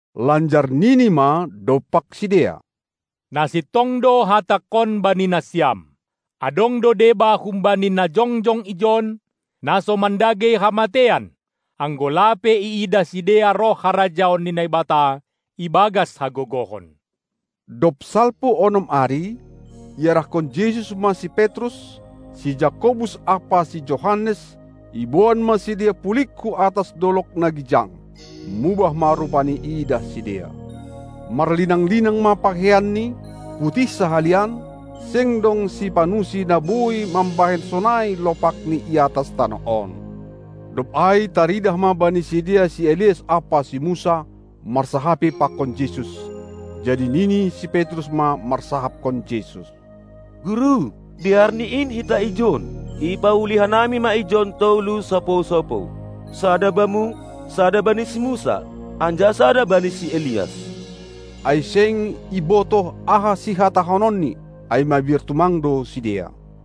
Lanjar nini ma dompak sidea: Na sintong do Hatangkon bani nasiam: Adong do deba humbani na jongjong ijon, na so mandagei hamateian, anggo lape iidah sidea roh harajaon ni Naibata ibagas hagogohon. Dob salpu onom ari iarahkon Jesus ma si Petrus, si Jakobus ampa si Johannes, iboan ma sidea pulig hu atas dolog na gijang. Mubah ma rupaNi iidah sidea. Marlinang-linang ma pakeianNi, putih sahalian, seng dong sipanusi na boi mambahen sonai lopakni i atas tanoh on. Dob ai taridah ma bani sidea si Elias ampa si Musa, marsahapi pakon Jesus. Jadi nini si Petrus ma marsahapkon Jesus: Guru, dear ni in hita ijon. Ipauli hanami ma ijon tolu sopou-sopou, sada Bamu, sada bani si Musa, anjaha sada bani si Elias. Ai seng ibotoh aha sihatahononni, ai mabiar tumang do sidea.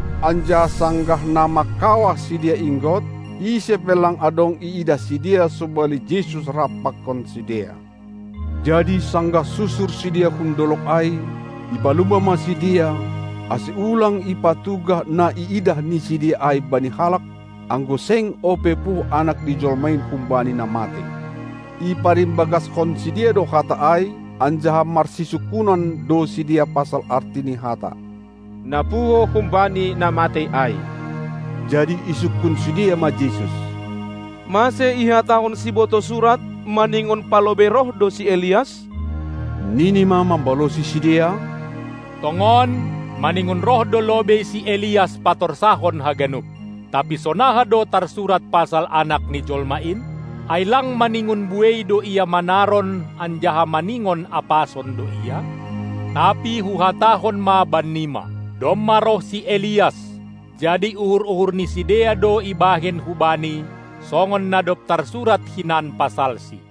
Anjaha sanggah na mangkawah sidea inggot, ise pe lang adong iidah sidea sobali Jesus rap pakon sidea. Jadi sanggah susur sidea hun dolog ai, ipalumba ma sidea, ase ulang ipatugah na niidah ni sidea bani halak, anggo seng ope puho Anak ni jolma in humbani na matei. Iparimbagaskon sidea do hata ai, anjaha marsisungkunan do sidea pasal arti ni hata "na puho humbani na matei ai", Jadi isungkun sidea ma Jesus: Mase ihatahon sibotoh surat, maningon palobei roh do si Elias? Nini ma mambalosi sidea: Tongon, maningon roh do lobei si Elias patorsahon haganup. Tapi sonaha do tarsurat pasal Anak ni jolma in? Ai lang maningon buei do Ia manaron anjaha maningon apason do Ia? Tapi Huhatahon ma bannima: Domma roh si Elias, jadi uhur-uhur ni sidea do ibahen hubani, songon na dob tarsurat hinan pasalsi.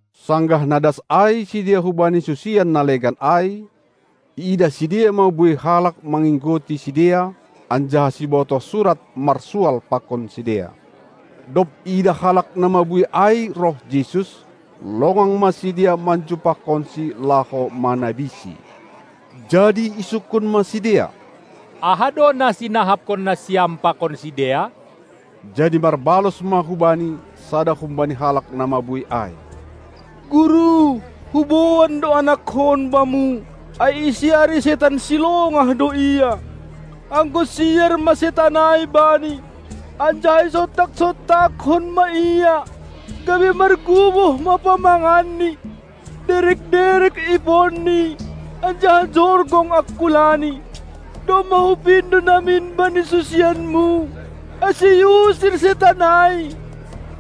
Sanggah na das ai sidea hubani susian na legan ai, iidah sidea ma buei halak manginggoti sidea, anjaha sibotoh surat marsual pakon sidea. Dob iidah halak na mabuei ai roh Jesus, longang ma sidea manjumpahkonSi laho manabiSi. Jadi isungkun ma sidea: Aha do na sinahapkon nasiam pakon sidea? Jadi marbalos ma hu Bani sada humbani halak na mabuei ai: Guru, huboan do anakkon Bamu, ai isiari setan silongah do ia. Anggo siar ma setan ai bani, anjaha isontak-sontakkon ma ia, gabe marguboh ma pamanganni, derek-derek iponni anjaha jorgong angkulani. Domma hupindo namin bani susianMu, ase iusir setan ai,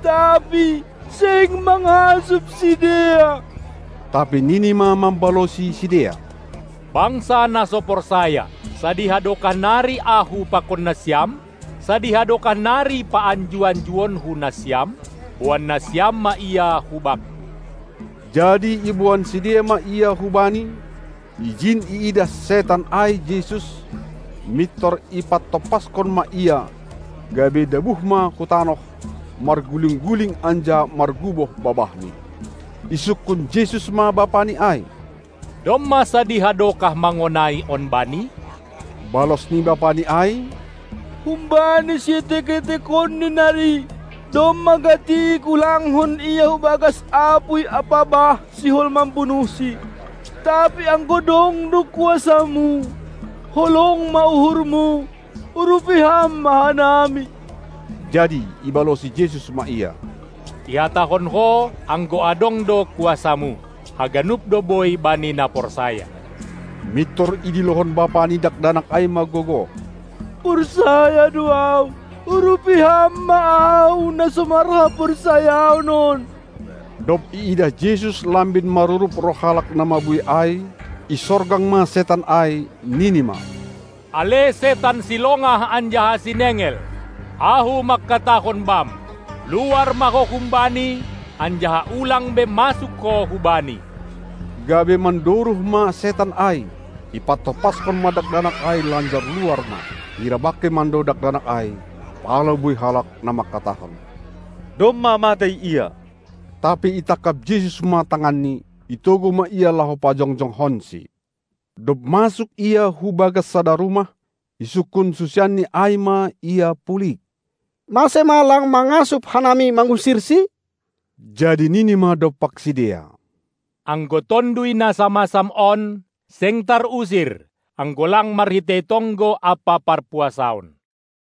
tapi seng mangasup sidea. Tapi nini ma mambalosi sidea: Bangsa na so porsaya! Sadiha dokah nari Ahu pakon nasiam? Sadiha dokah nari paanju-anjuonKu nasiam? Boan nasiam ma ia hu Bakku! Jadi iboan sidea ma ia hu Bani. Ijin iidah setan ai Jesus, mintor ipantompashon ma ia, gabe dabuh ma hu tanoh, marguling-guling anjaha marguboh babahni. Isungkun Jesus ma bapani ai: Domma sadiha dokah mangonai on bani? Balos ni bapani ai: Humbani sietek-etekonni nari. Domma gati igulangkon ia hu bagas apuy ampa bah, sihol mambunuhsi. Tapi anggo dong do kuasaMu, holong ma uhurMu, urupi Ham ma hanami. Jadi ibalosi Jesus ma ia: Ihatahon ho, anggo adong do kuasaMu. Haganup do boi bani na porsaya. Mintor idilohon bapa ni dakdanak ai ma gogoh: Porsaya do ahu! Urupi Ham ma ahu na so marhaporsayaon on. Dob iidah Jesus lambin marurup roh halak na mabuei ai, isorgang ma setan ai, nini ma: Ale setan silongah anjaha sinengel, Ahu mangkatahon bam: Luar ma ho humbani, anjaha ulang be masuk ho hubani! Gabe mandoruh ma setan ai, ipantompaskon ma dakdanak ai lanjar luar ma. Hira bangkei mando dakdanak ai, pala buei halak na mangkatahon: Domma matei ia. Tapi itangkap Jesus ma tanganni, itogu ma ia laho pajongjongkonsi. Dob masuk Ia hu bagas sada rumah, isungkun susianNi ai ma Ia pulig: Mase ma lang mangasup hanami mangusirsi? Jadi nini ma dompak sidea: Anggo tonduy na samasam on, seng tarusir, anggo lang marhitei tonggo ampa parpuasaon.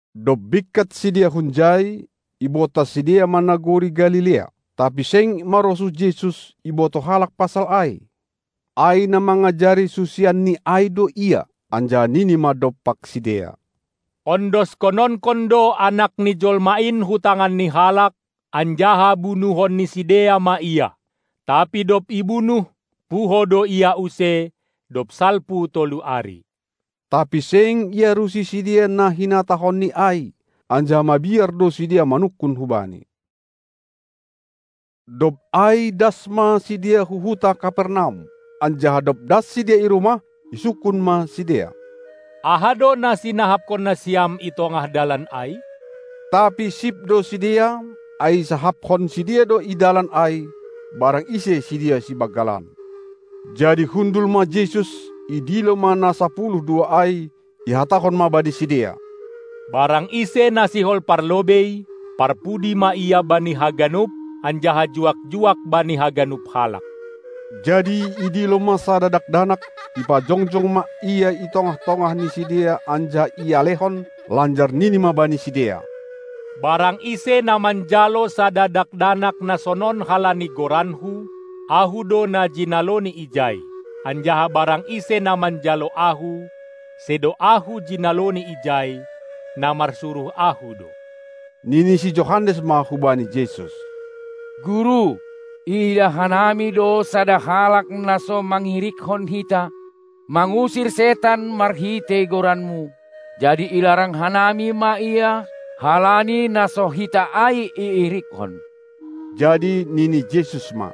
Dob bingkat sidea hunjai, ibontas sidea ma nagori Galilea. Tapi seng marosuh Jesus, ibotoh halak pasal ai, ai na mangajari susianNi ai do Ia, anjaha nini ma dompak sidea: Ondoskononkon do Anak ni jolma in hu tangan ni halak, anjaha bunuhon ni sidea ma Ia; tapi dob ibunuh, puho do Ia use, dob salpu tolu ari. Tapi seng iarusi sidea na hinatahonNi ai, anjaha mabiar do sidea manungkun hu Bani. Dob ai das ma sidea hu huta Kapernaum, anjaha dob das sidea i rumah, isungkun ma sidea: Aha do na sinahapkon nasiam i tongah dalan ai? Tapi sip do sidea, ai isahapkon sidea do i dalan ai, barang ise sidea sibanggalan. Jadi hundul ma Jesus, idilo ma na sapuluh dua ai, ihatahon ma bani sidea: Barang ise na sihol parlobei, parpudi ma ia bani haganup anjaha, juak-juak bani haganup halak. Jadi idilo ma sada dakdanak, ipajongjong ma ia i tongah-tongah ni sidea anjaha ialehon, lanjar nini ma bani sidea: Barang ise na manjalo sada dakdanak na sonon halani goranKu, Ahu do na jinaloni ijai, anjaha barang ise na manjalo Ahu, sedo Ahu jinaloni ijai, na marsuruh Ahu do. Nini si Johannes ma hubani Jesus: Guru, iidah hanami do sada halak na so mangirikkon hita mangusir setan marhitei goranMu, jadi ilarang hanami ma ia halani na so hita ai iirikkon. Jadi nini Jesus ma: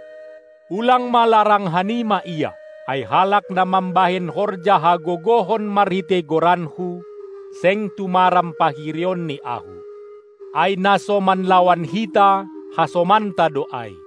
Ulang ma larang hanima ia, ai halak na mambahen horja hagogohon marhitei goranKu, seng tumaram pahirionni Ahu. Ai na so manlawan hita, hasomanta do ai.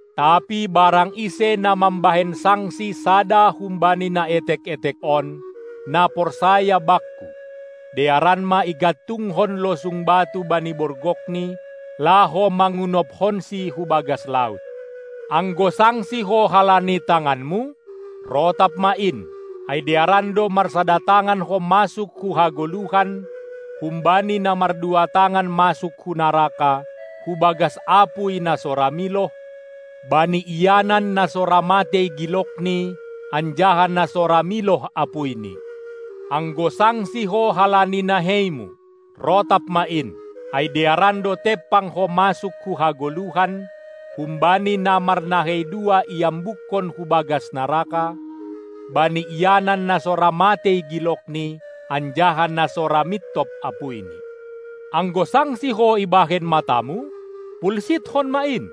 Tapi barang ise na mambahen sangsi sada humbani na etek-etek on, na porsaya Bakku, dearan ma igantungkon losung batu bani borgokni, laho mangunobkonsi hu bagas laut. Anggo sangsi ho halani tanganmu, rotap ma in. Ai dearan do marsada tangan ho masuk hu hagoluhan, humbani na mardua tangan masuk hu naraka, hu bagas apuy na so ra miloh, bani ianan, na so ra matei gilokni, anjaha na so ra miloh apuyni. Anggo sangsi ho halani naheimu, rotap ma in. Ai dearan do tempang ho masuk hu hagoluhan, humbani na marnahei dua iambukkon ho hu bagas naraka, bani ianan na so ra matei gilokni, anjaha na so ra mintop apuyni. Anggo sangsi ho ibahen matamu, pulsitkon ma in.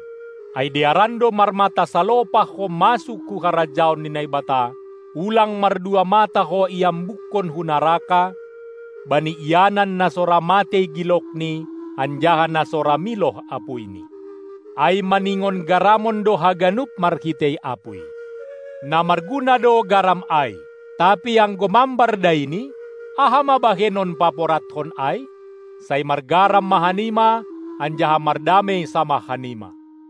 Ai dearan do marmata salopah ho masuk hu harajaon ni Naibata, ulang mardua mata ho iambukkon hu naraka, bani ianan na so ra matei gilokni anjaha na so ra miloh apuyni. Ai maningon garamon do haganup marhitei apuy. Na marguna do garam ai. Tapi anggo mambar daini, aha ma bahenon paporadkon ai? Sai margaram ma hanima, anjaha mardamei samah hanima.